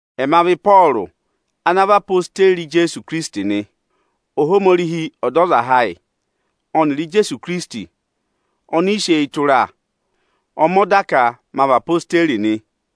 Ẹma vị Ịpọọrụ ana vị odeyi Ijeesu Ikirisiti nị. Ohomorihi, Ọdọzaha ayị, ọnịrị Ijeesu Ikirisiti oni i sị eyi tụra, ọ mẹ ọda ka ma vị odeyi nị.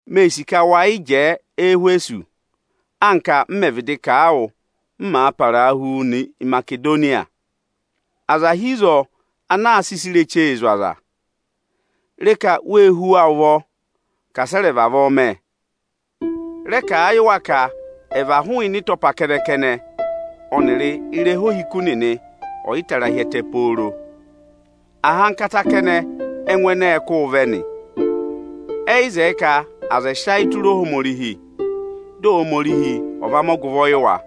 Mee sì ka wa yị jẹẹ Ẹhwẹsọsị, anka m mẹ̀ vịdị kà a wụ, m màa parahuu nọ Imasedoniya. Aza hi ịzọọ ana aa sị ịsa irechee zụ̀ aza. Re ka wee hú wa ụvọ ka asị ẹ rẹ̀ vavọọ mẹ! Rẹ kà a yị wa ka ẹ̀ và hụụnị ịtọpa kẹnẹ-kẹnẹ ọnịrị ịrẹha ohiku nịnị ọyịtara hi ẹtẹ pooro! Ahankata kẹnẹ ẹ́ngụ ẹnẹ ẹẹ̄ kụ́ụ vẹ nị. Ẹyị zẹẹ ka aza ẹ̀ sị ayị tụra Ohomorihi, dị Ohomorihi ọ̀ va mẹ ọgụvọ yị wa.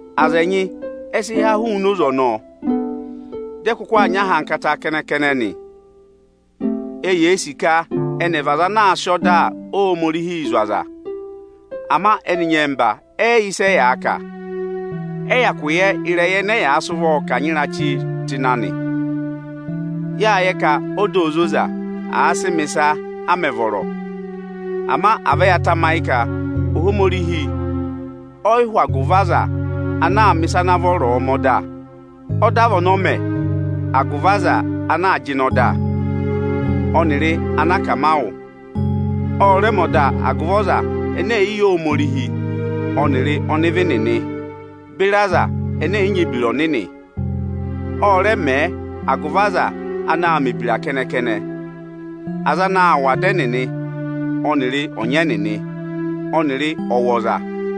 Aza ẹnyị ẹ sị há hụụnị oze ọnọọ, dị ẹ kụkụ aa nyị ahankata kẹnẹ-kẹnẹ nị. Eyee sì ka ẹnị ẹ̀ vị aza anaā sịị ọda Ohomorihii zụ̀ aza. Ama ẹnị nyẹmba ẹ yị yẹ ịsị ẹyaa kà, ẹ yị hyakụ yẹ ịrẹyị ẹnẹ ẹyaa sị ụvọọ kanyị ịrachịị tụ́ ịnị anị. Yáa yẹ ka ọda óo zoza, àa sị mẹ̀ ịsa a mẹ̀ vọrọ. Ama à vẹ ya tamayị ka Ohomorihi ọyị hụ agụvị aza ana aa mẹ̀ ịsa ana vọrọọ mẹ ọda. Ọda vị ọnị ọ mẹ agụvị aza anaā jịnẹ ọda, ọnịrị anakamawụ. Ọ rẹ mẹ ọda agụvị aza ẹnẹ ẹ̀yị yẹ Ohomorihi ọnịrị ọnịvị nịnị beri aza ẹnẹ ẹ̀yị nyị ebira ọnịnị. Ọ rẹ mẹẹ agụvị aza anaā mẹ̀ ebira kẹnẹ-kẹnẹ, aza anaā wụ ada ẹnịnị ọnịrị ọnyị ẹnịnị, ọnịrị ọwọza.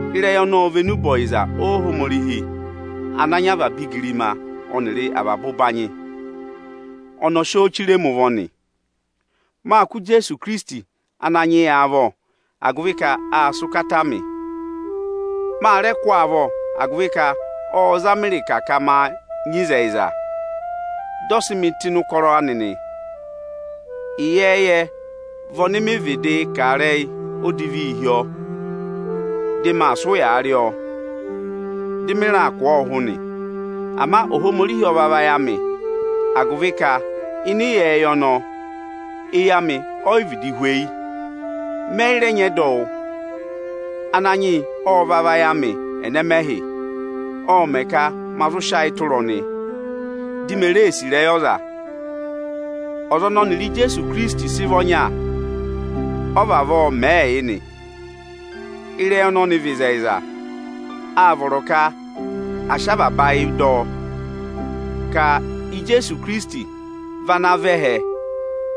Ịrẹyị ọnọọ vị enube ọyịza Ohomorihi ana nyị avaba igirima ọnịrị avaba ụbanyị. Ọnị ọ sị ọọ chire mi ụvọ nị. Máa kụ́ Ijeesu Ikirisiti Ananyị yị avọ, agụvị ka aa sị ụkataa mị. Ma rẹ kụ́ ọọ avọ, agụvị ka ộ za mị ịrịka ka máa nyị ịzẹyịza, dị ọ sị mị tụ́ ịnị ụkọrọ anị nị. Ịyẹẹyẹ vị ọnị mịị̄ vịdịị kà ịrẹyị odivii hi ọọ, dị maa sị ụyaa rị ọọ, dị mị raa kụ̀ ọọ ụhụ nị. Ama Ohomorihi ọ va vayị amị, agụvị ka ịnị ịyẹẹyẹ ọnọọ, eyi amị oyi vịdị hweyi, mẹ yị rẹ nyị ẹdọwụ. Ananyị yị ọ va vayị amị ẹnẹmẹhị; ộ mẹ̀ ka ma zụ sị ayị tụra ọnị, di me ree sì ịrẹyị ọza. Ọza ọnị ọnịrị Ijeesu Ikirisiti sị vị ọnya, ọọ̄ vavọọ mẹẹ yị nị. Ịrẹyị ọnọnị vị ịzẹyịza, áa vọrọ ka à sị avaba ayị dọ ọ; ka Ijeesu Ikirisiti vị ana vẹ ẹhẹ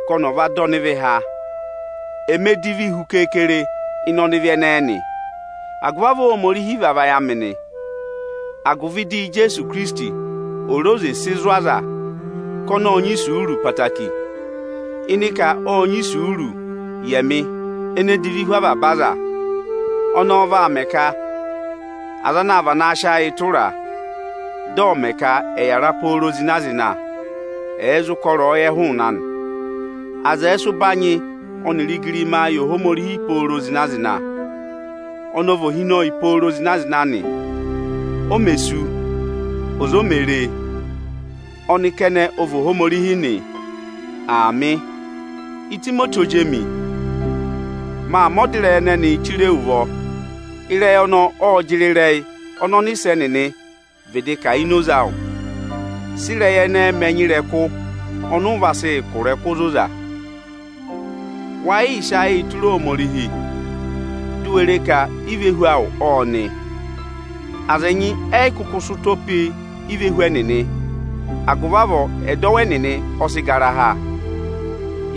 ka ọnị ọ̀ va dọ ọnịvị há. Eme divi hu keekere ịnị ọnịvị ẹnẹẹ nị. Agụvị avọọ Ohomorihi va vayị amị nị, agụvị dị Ijeesu Ikirisiti ò re oze sị zụ̀ aza ka ọnị ọ́ọ nyị isuuru ẹtẹẹtẹrẹ, ịnị ka ộ nyị isuuru yị ẹmị ene divi hu avaba aza. Ọnọọ vaa mẹ ka aza anaa vanaa sị ayịị tụra, dị ọ̀ mẹ ka ẹ̀ yàra pooro zịna-zịna, ẹ̀ zụ kọ ịrẹyọyẹ hụụnị anị. Aza ẹ̀ẹ sị ụbanyị ọnịrị igirimaa yị Ohomorihi pooro zịna-zịna! Ọnị ọ vị ohinọyị pooro zịna-zịna nị; o mē sú, ọza o mē ree. Ọnị kẹnẹ ọ vị Ohomorihi nị. Aamị. Itimoti ozi emi, maa mẹ̀ ọda ịrẹyị ẹnẹnịị yị wu. Ịrẹyị ọnọọ ọ́ọ jịrị ịrẹyị ọnị ọnịsẹ nịnị vịdị kà ini oze awụ. Sị ịrẹyị ẹnẹẹ mẹ ẹnya ịrẹkụ ọnị ụ vaa sị kụ̀ ịrẹkụ ozoza! Wa yịị sị ayịị tụra Ohomorihi, di u we re ka ivehu awụ ọ́ọ nị! Aza ẹnyị ẹyị kụkụ sị ụtọ pe ivehu ẹnịnị, agụvị avọọ ẹdọwụ ẹnịnị ọ sị gara ha.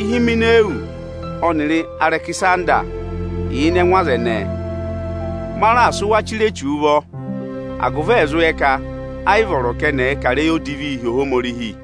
Ihimenawusi ọnịrị Arẹkịsanda yà ịnị ẹngụ aza ẹnẹẹ. Ma raà sị wa chire Echu ụvọ, agụvị ẹ̀ zụ yẹ ka ẹ yị vọrọ ka ẹnị ẹ̀ẹ kà ịrẹyị odivi hi Ohomorihi.